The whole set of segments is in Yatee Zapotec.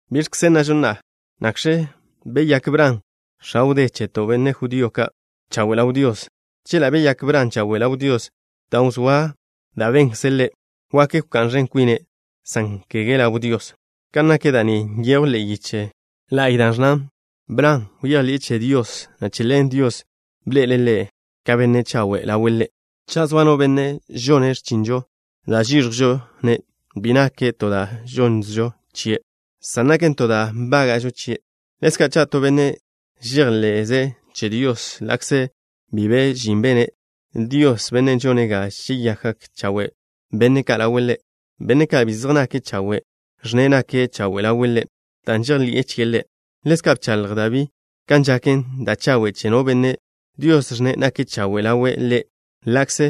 ¿Biẕkze nnažo na'a? ¿Nakx̱ beyák Bran, x̱a wdé cheto', benne' judío ka', chawe' ḻaw Dios? Chela' beyák Bran chawe' ḻaw Dios dan' wzóa da' benkze' ḻe', wak wká'n ẕen kwine', san kege ḻaw Dios. Kan nak da' ni nyejw ḻe'e yiche la'y da' ẕnnan: “Bran bejḻi'e che Dios, na' che ḻen Dios bḻe'ele' ḻe' ka benne' chawe' ḻawe' Ḻe'.” Cha' zoa no benne' žone' x̱chinžo, da' žíẕjwžo-ne' bi naken to da' žonnžo chie', san naken to da' nbága'žo chie'. Ḻezka' cha' to benne' žejḻe'ze' che Dios, ḻa'kze bi be žin bene', Dios, Bennen' žone' ga žeyakgak chawe' benne' ka' ḻawe' Ḻe', benne' ka' bi zej nake' chawe', ẕnne' nake' chawe' ḻawe' ḻe' dan' žejḻi'e chie' Ḻe'. Ḻezka' bchaḻj Dabí kan žaken da' chawe' che no benne', Dios ẕnne' nake' chawe' ḻawe' Ḻe' ḻa'kze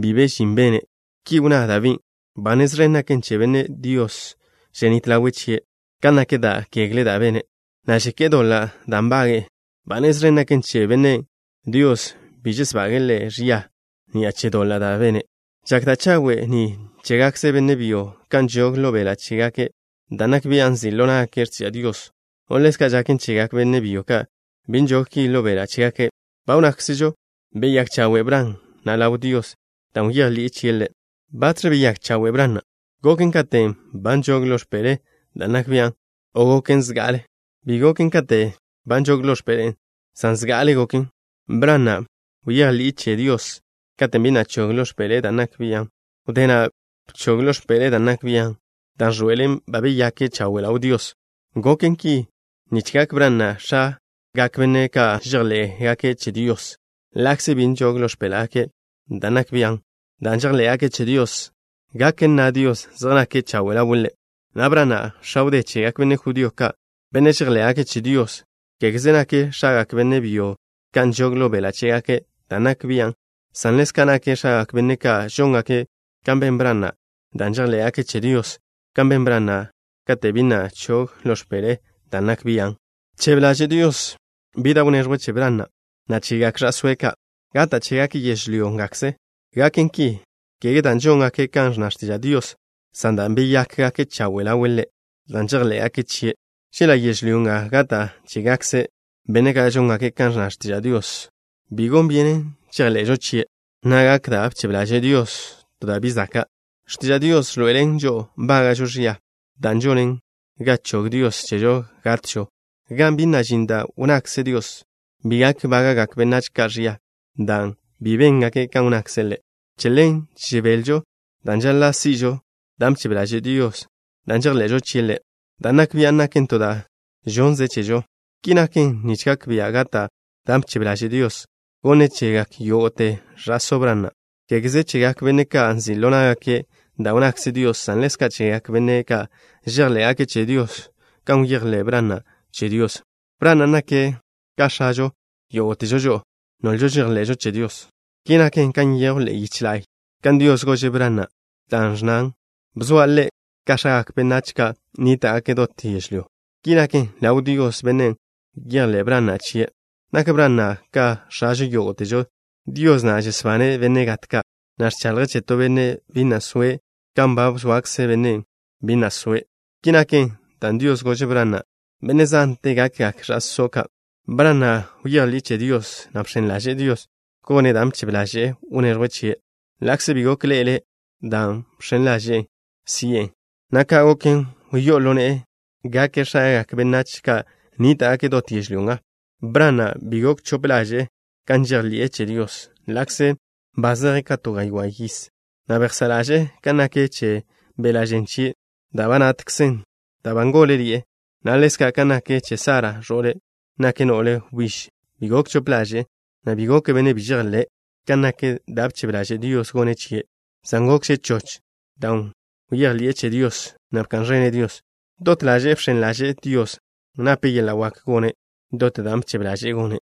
bi be žin bene'. Ki wnná Dabín': Ba nez ẕen naken che bennen' Dios ženít ḻawe' chie' ka nak da' kegle da' bene'. Na' žeké'e doḻa' da' nbage'e. Ba nez ẕen naken che bennen', Dios bi žesbage'e ḻe' ẕia ni'a che doḻa' da' bene'. ¿Žak da' chawe' ni chégakze benne' byo ka' nžog ḻo beḻa' chégake' dan' nak bian' nzi' ḻo ná'gake' x̱tiža' Dios, o ḻezka' žaken chegak benne' byo ka' bi nžog ki ḻo beḻa' chégake'? Ba wnnákzežo beyák chawe' Bran na' ḻaw Dios dan' bejḻi'e chie' Ḻe'. ¿Batx̱ beyák chawe' Bran na'? ¿Goken katen' ba nžog ḻo x̱peḻe'e dan' nak bian', o goken zga'ale? Bi goken kate' ba nžogen ḻo x̱peḻe'e, san zga'ale goken. Bran na' bejḻi'e che Dios katen' bi na' chog ḻo x̱peḻe'e dan' nak bian'. Wdé na' bchog ḻo x̱peḻe'e dan' nak bian', dan' ẕḻoe'elen ba beyake' chawe' ḻaw Dios. Goken ki nich gak Bran na' ka x̱agak benne' ka' chejḻé'gake' che Dios, ḻa'kze bi nžog ḻo x̱péḻa'gake' dan' nak bian'. Dan' žejḻé'gake' che Dios, gak nna Dios zej nake' chawe' ḻawe' Ḻe'. Nak Bran na' x̱a wdé chegak benne' judío ka', benne' žejḻé'gake' che Dios. Kégeze nake' x̱agak benne' byo ka' nžog ḻo beḻa' chégake' dan' nak bian', san ḻezka' nake' x̱agak benne' ka' žóngake' kan ben Bran na', dan' žejḻé'gake' che Dios kan ben Bran na' kate' bi na' chog ḻo x̱peḻe'e dan' nak bian'. Bchebe ḻaže' Dios bi da' wneẕjwe' che Bran na', na' chegak ẕa'sóe' ka', gata' chégake' yežlyó ngakze. Gaken ki, kege dan' žóngake' kan ẕnna x̱tiža' Dios, san dan' beyákgake' chawe' ḻawe' Ḻe' dan' žejḻé'gake' chie'. Chela' yežlyó nga gata' chégakze benne' ka' žóngake' kan ẕnna x̱tiža' Dios, bi gon byenen chejḻe'žo chie', na' gak da' bchebe ḻaže' Dios to da' bi zaka'. X̱tiža' Dios ẕḻoe'elen žo'o nbága'žo ẕia, da' žonen ga chog Dios chežo gatžo. Gan bi na' žin da' wnnakze Dios, bi gak bága'gak benách ka' ẕia dan' bi béngake' kan wnnakze' Ḻe'. Che ḻen žebelžo dan' žaḻa' si'žo dan' bchebe ḻaže' Dios dan' žejḻe'žo chie' Ḻe', dan' nak bian' naken to da' žonnze' chežo. Ki naken nich gak bia' gata' dan' bchebe ḻaže' Dios gonne' chegak yógo'te ẕa'só Bran na', kégeze chegak benne' ka' nzi' ḻo ná'gake' da' wnnakze Dios, san ḻezka' chegak benne' ka' žejḻé'gake' che Dios kan bejḻé' Bran na' che Dios. Bran na' nake' ka x̱ažo yógo'težo žo'o, nolžo žejḻe'žo che Dios. Ki naken kan nyejw ḻe'e yiche la'y kan Dios gože' Bran na', dan' ẕnnan: “Bzoa' le' ka x̱agak benách ka' nníta'gake' dot yežlyó.” Ki naken, ḻaw Dios, Bennen' bejḻé' Bran na' chie', nak Bran na' ka x̱ažo yógo'težo. Dios na' žesbane' benne' gat ka', na' ẕchaḻje' che to benne' bi na' soe' kan ba zoakze bennen' bi na' soe'. Ki naken dan' Dios gože' Bran na': “Benne' zante gakgak ẕa'só' ka'.” Bran na' bejḻi'e che Dios, na' bx̱en ḻaže'e Dios gone' dan' bchebe ḻaže'e wneẕjwe' chie', ḻa'kze bi gok ḻe'ele' dan' žx̱en ḻaže'e si'e, na' ka' goken, wyó'o ḻo ne'e gake' x̱agak benách ka' nníta'gake' dot yežlyó nga. Bran na' bi gok chop ḻaže'e kan žejḻi'e che Dios, ḻa'kze ba zeje' ka to gaywá' yiz, na' bejsá' ḻaže'e kan nak che beḻa' žen chie', da' ba natkzen dan' ba ngóleḻi'e, na' ḻezka' kan nak che Sara, ẕo'le', nake' no'le wbíž. Bi gok chop ḻaže'e, na' bi goke' benne' bi žejḻé' kan nak da' bchebe ḻaže' Dios gone' chie', san gokže' choch dan' bejḻi'e che Dios, na' bka'n ẕene' Dios. Dot ḻaže'e bx̱en ḻaže'e Dios, nape' yeḻa' wak gone' dot dan' bchebe ḻaže'e gone'.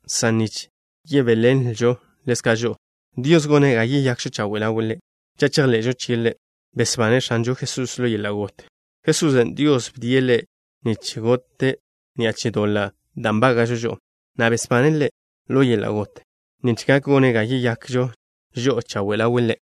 san nich yebéḻenlžon ḻezka' žo'o. Dios gone' ga yeyakžo chawe' ḻawe' Ḻe' cha' chejḻe'žo chie' Ḻe', besbane' X̱anžo Jesusen' ḻo yeḻa' got. Jesusen', Dios bdie' Ḻe' nich gote' ni'a che doḻa' da' nbága'žo žo'o, na' besbane' Ḻe' ḻo yeḻa' got, nich gak gone' ga yeyakžo žo'o chawe' ḻawe' Ḻe'.